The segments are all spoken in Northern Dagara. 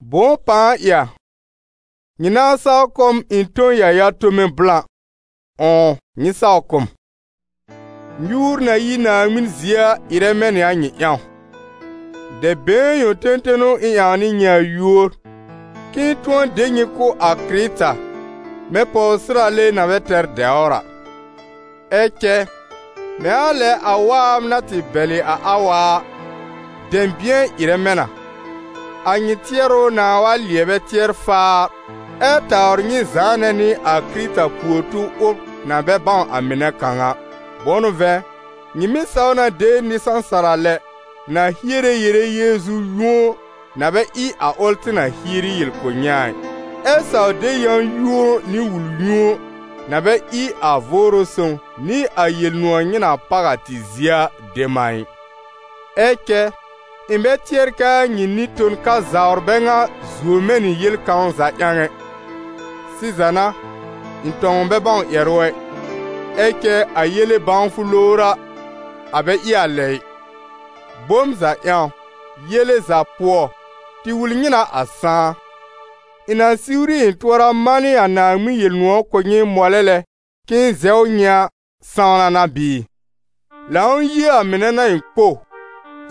Bʋ̃ʋ pãa ɩ a! Nyɩ nãa saw kʋ̀ m ɩ̃ tõ yãya-tome blã! Ʋ̃ʋ nyɩ saw kʋ̀ m! Nyuur na yi Naaŋmɩn zie a ɩrɛ mɛ̃ nɩ a nyɩ ƴãw. Dɛb-been yõ tẽtẽ n'ʋ ɩ̃ ƴãw nɩ nyɩ a yúor, k'ɩ̃ɩ tʋ̃ɔ de nyɩ kʋ̀ a Kɩrɩta mɛ̃ pɔwsɩrale na bɛ tɛr dɛwr a. Ɛ cɛ, mɛ̃ a lɛ a waab na tɩ bɛlɩ a Awa a, dɛ̃bɩ̃ɛ ɩrɛ mɛ̃ na, a nyɩ tɩɛrʋ nãa wa lɩɛbɛ tɩɛr-faar ɛ tawr nyɩ zãanɛ nɩ a Kɩrɩta puor-tub ʋl na bɛ bãw a mɩnɛ kãw a. Bʋ̃ʋ n'ʋ vɛ̃, nyɩ mɩ́ saw na de nɩ-sãsara lɛ na hiere yere Yeezu-yũo na bɛ ɩ a ʋl tɩ na hieri yel kʋ̀ nyɩ a ɩ, ɛ saw de yã-yũo nɩ wul-yũo na bɛ ɩ a Vʋʋrʋ Sõw nɩ a Yel-nʋ̃ɔ̀ nyɩ na páw a tɩ zie a dem a ɩ. Ɛ cɛ, ɩ̃ bɛ tɩɛr kɛ a nyɩ nɩ-ton-kazawr bɛ ŋa zuo mɛ̃ nɩ yel kãw za ƴãw ɛ. Sɩza n'a, ɩ̃ tɔ̃w bɛ bãw ƴɛrʋ ɛ, ɛ cɛ a yele-bãwfʋ lowr a, a bɛ ɩ a lɛ ɩ: bom za ƴãw, yele za pʋɔ, tɩ wul nyɩ na a sãá. Ɩ̃ na siwri ɩ̃ tʋɔra manɩ a Naaŋmɩn Yel-nʋ̃ɔ̀ kʋ̀ nyɩ mɔlɛ lɛ k'ɩ̃ɩ zɛw nyɩ a, sãwna n'a bɩɩ? Lãw-yie a mɩnɛ n'a ɩ̃ kpow,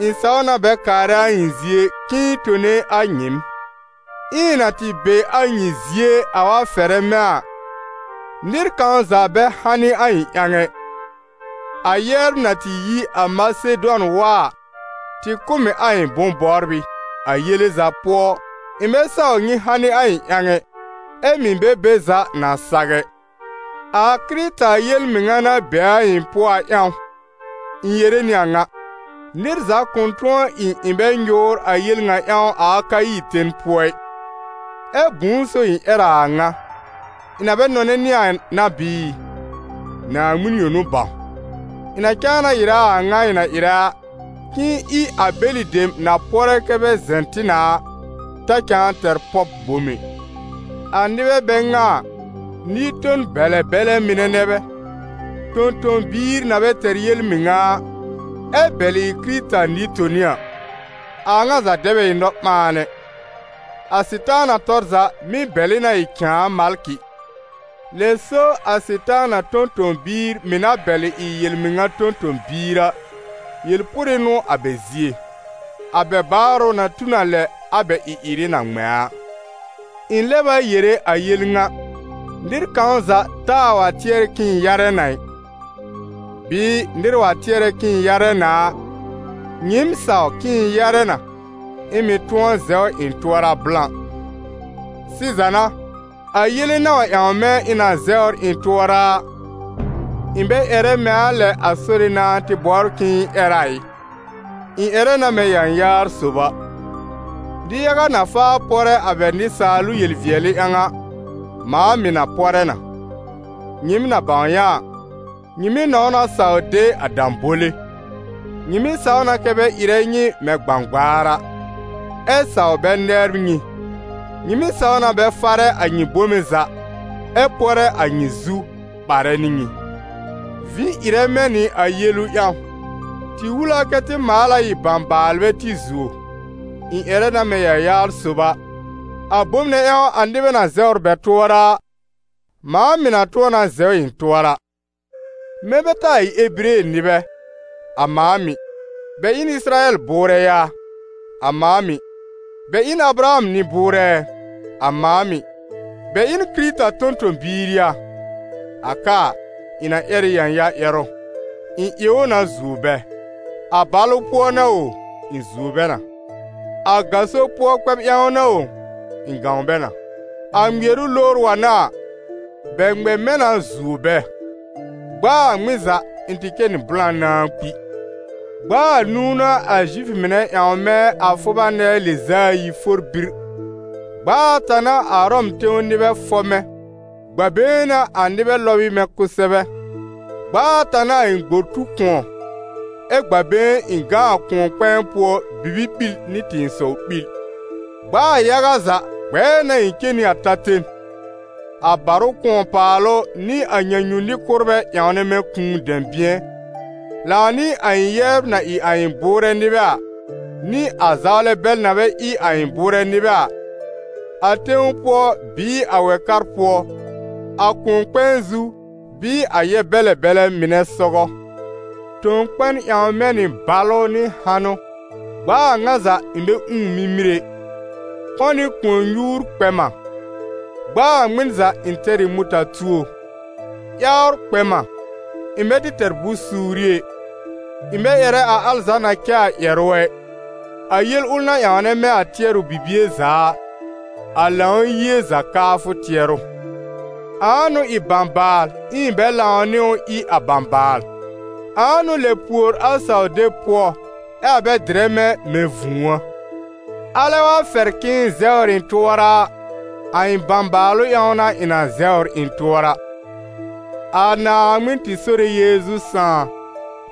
ɩ̃ saw na bɛ kaarɛ a ɩ̃ zie k'ɩ̃ɩ tone a nyɩɩm. Ɛ ɩ̃ na tɩ be a nyɩ zie, a wa fɛrɛ mɛ̃ a, nɩr kãw za bɛ hanɩ a ɩ̃ ƴãw ɛ, a yɛbr na tɩ yi a Masedʋan wa a tɩ kʋ̀ m ɩ a ɩ̃ bʋ̃-bɔbrɩ; a yele za pʋɔ, ɩ̃ bɛ saw nyɩ hanɩ a ɩ̃ ƴãw ɛ, ɛ́ mɩ̀ bɛ be za na saw ɛ. A Kɩrɩta yel-mɩŋa na be a ɩ̃ pʋɔ a ƴãw, ɩ̃ yere nɩ a ŋa: nɩr za kʋ̃ tʋ̃ɔ ɩ ɩ̃ bɛ nyʋʋr a yel ŋa ƴãw a Akayi ten pʋɔ ɩ. Ɛ bʋ̃ʋ so ɩ̃ ƴɛr a a ŋa? Ɩ̃ na bɛ nɔnɛ nyɩ a n'a bɩɩ? Naaŋmɩn yõ n'ʋ bãw! Ɩ̃ na cãa na ɩrɛ a a ŋa ɩ̃ na ɩrɛ a, k'ɩ̃ɩ ɩ a bɛlɩ dem na pɔrɛ kɛ́ bɛ zɛ̃ tɩ na a, ta cãa tɛr pɔb bom ɛ. A nɩbɛ bɛ ŋa a, nɩ-ton-bɛlɛ bɛlɛ mɩnɛ nɛ bɛ, tõ-tõ-biir na bɛ tɛr yel-mɩŋa a, ɛ bɛlɩ ɩ Kɩrɩta nɩ-toni a. A a ŋa za dɛ bɛ ɩ nɔ-ɓãan ɛ: a Sɩtaana tɔr za mɩ́ bɛlɩ na ɩ cãa malkɩ. Lɛ so a Sɩtaana tõ-tõ-biir mɩ̀ na bɛlɩ ɩ yel-mɩŋa tõ-tõ-biir a, yel-pʋrɩ n'ʋ a bɛ zie. A bɛ baarʋ na tu n a lɛ a bɛ ɩ-ɩrɩ na ŋmɛ̃ a. Ɩ̃ lɛb a yere a yel ŋa: nɩr kãw za taa wa tɩɛr k'ɩ̃ɩ yarɛ na ɩ. Bɩɩ nɩr wa tɩɛrɛ k'ɩ̃ɩ yarɛ na a, nyɩɩm saw k'ɩ̃ɩ yarɛ na, ɩ̃ mɩ̀ tʋ̃ɔ zɛw ɩ̃ tʋɔra blã. Sɩza n'a, a yele na wa ƴãw mɛ̃ ɩ̃ na zɛwr ɩ̃ tʋɔra a, ɩ̃ bɛ ƴɛrɛ mɛ̃ a lɛ a Sore nãa tɩ bɔbr k'ɩ̃ɩ ƴɛr a ɩ, ɩ̃ ƴɛrɛ na mɛ̃ yãyaar sob a. Nɩ-yaga na faa pɔrɛ a bɛ nɩsaalʋ yel-vɩɛlɩ ƴãw a, mãa mɩ̀ na pɔrɛ na. Nyɩɩm na bãw yã a, nyɩ mɩ́ nɔ̃w na saw de a dãbole. Nyɩ mɩ́ saw na kɛ bɛ ɩrɛ nyɩ mɛ̃ gbãgbaar a, ɛ saw bɛ nɛbr nyɩ, nyɩ mɩ́ saw na bɛ farɛ a nyɩ bome za ɛ pɔrɛ a nyɩ zu, ɓarɛ nɩ nyɩ. Vĩ ɩrɛ mɛ̃ nɩ a yelu ƴãw: tɩ wul a kɛ tɩ maal a ɩ bãbaalbɛ tɩ zuo! Ɩ̃ ƴɛrɛ na mɛ̃ yãyaar sob a, a bom nɛ ƴãw a nɩbɛ na zɛwr bɛ tʋɔra a, mãa mɩ̀ na tʋ̃ɔ na zɛw ɩ̃ tʋɔra. Mɛ̃ bɛ taa ɩ Ebire nɩbɛ? A mãa mɩ̀! Bɛ ɩ n Ɩsɩrayɛl bʋʋrɛ yaa? A mãa mɩ̀! Bɛ ɩ n Abraham nɩ-bʋʋrɛ ɛ? A mãa mɩ̀! Bɛ ɩ n Kɩrɩta tõ-tõ-biir yaa? A ka a, ɩ̃ na ƴɛr ɩ yãya-ƴɛrʋ: ɩ̃ ɩ ʋ na zuo bɛ. A balʋ pʋɔ n'a o, ɩ̃ zuo bɛ na, a gaso pʋɔ kpɛb ƴãw n'a o, ɩ̃ gãw bɛ na, a ŋmɩɛrʋ lowr wa n'a a, bɛ ŋmɛ mɛ̃ na zuo bɛ; gb'a a ŋmɩn za, ɩ̃ tɩ cɛ nɩ blã nãá kpi. Gb'a anũu n'a a Zifʋ mɩnɛ ƴãw mɛ̃ a fʋba nɛɛ lɩz'a ayi for bir, gb'a ata n'a a Ʋrɔm tẽw nɩbɛ fɔb mɛ̃, gb'a-been n'a a nɩbɛ lɔb ɩ mɛ̃ kʋsɛbɛ; gb'a ata n'a a ɩ̃ gbor tu kʋ̃ɔ, ɛ gb'aa been ɩ̃ gã a kʋ̃ɔ-kpɛ̃ɛ pʋɔ bibi-ɓil nɩ tɩ̃ɩsɔw-ɓil. Gb'aa yaga za, gbɛɛ n'a ɩ̃ cen nɩ a ta-ten, a barʋ kʋ̃ɔ-paalʋ nɩ a nyãnyu-nɩ-kʋ́rbɛ ƴãwnɛ mɛ̃ kũu dɛ̃bɩ̃ɛ, lãw nɩ a ɩ̃ yɛbr na ɩ a ɩ̃ bʋʋrɛ nɩbɛ a, nɩ a zawlɛ bɛl na bɛ ɩ a ɩ̃ bʋʋrɛ nɩbɛ a, a tẽw pʋɔ bɩɩ a wɛ-kar pʋɔ, a kʋ̃ɔ-kpɛ̃ɛ zu bɩɩ a yɛb-bɛlɛ bɛlɛ mɩnɛ sɔgɔ. Tõ-kpɛn ƴãw mɛ̃ nɩ balʋ nɩ hanʋ; gb'a a ŋa za, ɩ̃ bɛ ũù mimir ɛ; kɔ̃ nɩ kʋ̃ɔ-nyuur kpɛ m a; gb'a a ŋmɩn za ɩ̃ tɛr ɩ mʋta-tuo; ƴawr kpɛ m a, ɩ̃ bɛ tɩ tɛr bʋ̃-suuri ɛ. Ɩ̃ bɛ ƴɛrɛ a al za na cɛ a ƴɛrʋ ɛ, a yel ʋl na ƴãwnɛ mɛ̃ a tɩɛrʋ bibie za a: a Lãw-yie za kaafʋ tɩɛrʋ. Ãa n'ʋ ɩ bãbaal, ɩ̃ɩ bɛ lãw nɩ ʋ ɩ a bãbaal? Ãa n'ʋ lɛb pùor a saw-deb pʋɔ, ɛ a bɛ dɩrɛ mɛ̃ mɛ̃ vũu a? Alɛ wa fɛr k'ɩ̃ɩ zɛwr ɩ̃ tʋɔra a, a ɩ̃ bãbaalʋ ƴãw n'a ɩ̃ na zɛwr ɩ̃ tʋɔra. A Naaŋmɩn tɩ Sore Yeezu Sãà,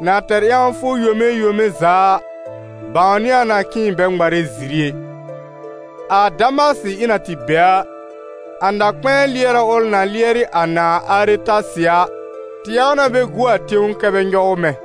na tɛr ƴãwfʋ yome yome za a, bãwnɩ a na k'ɩ̃ɩ bɛ ŋmarɛ ziri ɛ. A Damasɩ ɩ̃ na tɩ be a, a na-kpɛ̃ɛ lɩɛrɛ ʋl na lɩɛrɩ a nãà Aretasɩ a, tɩ ƴãw na bɛ gu a tẽw kɛ́ bɛ nyɔw mɛ̃.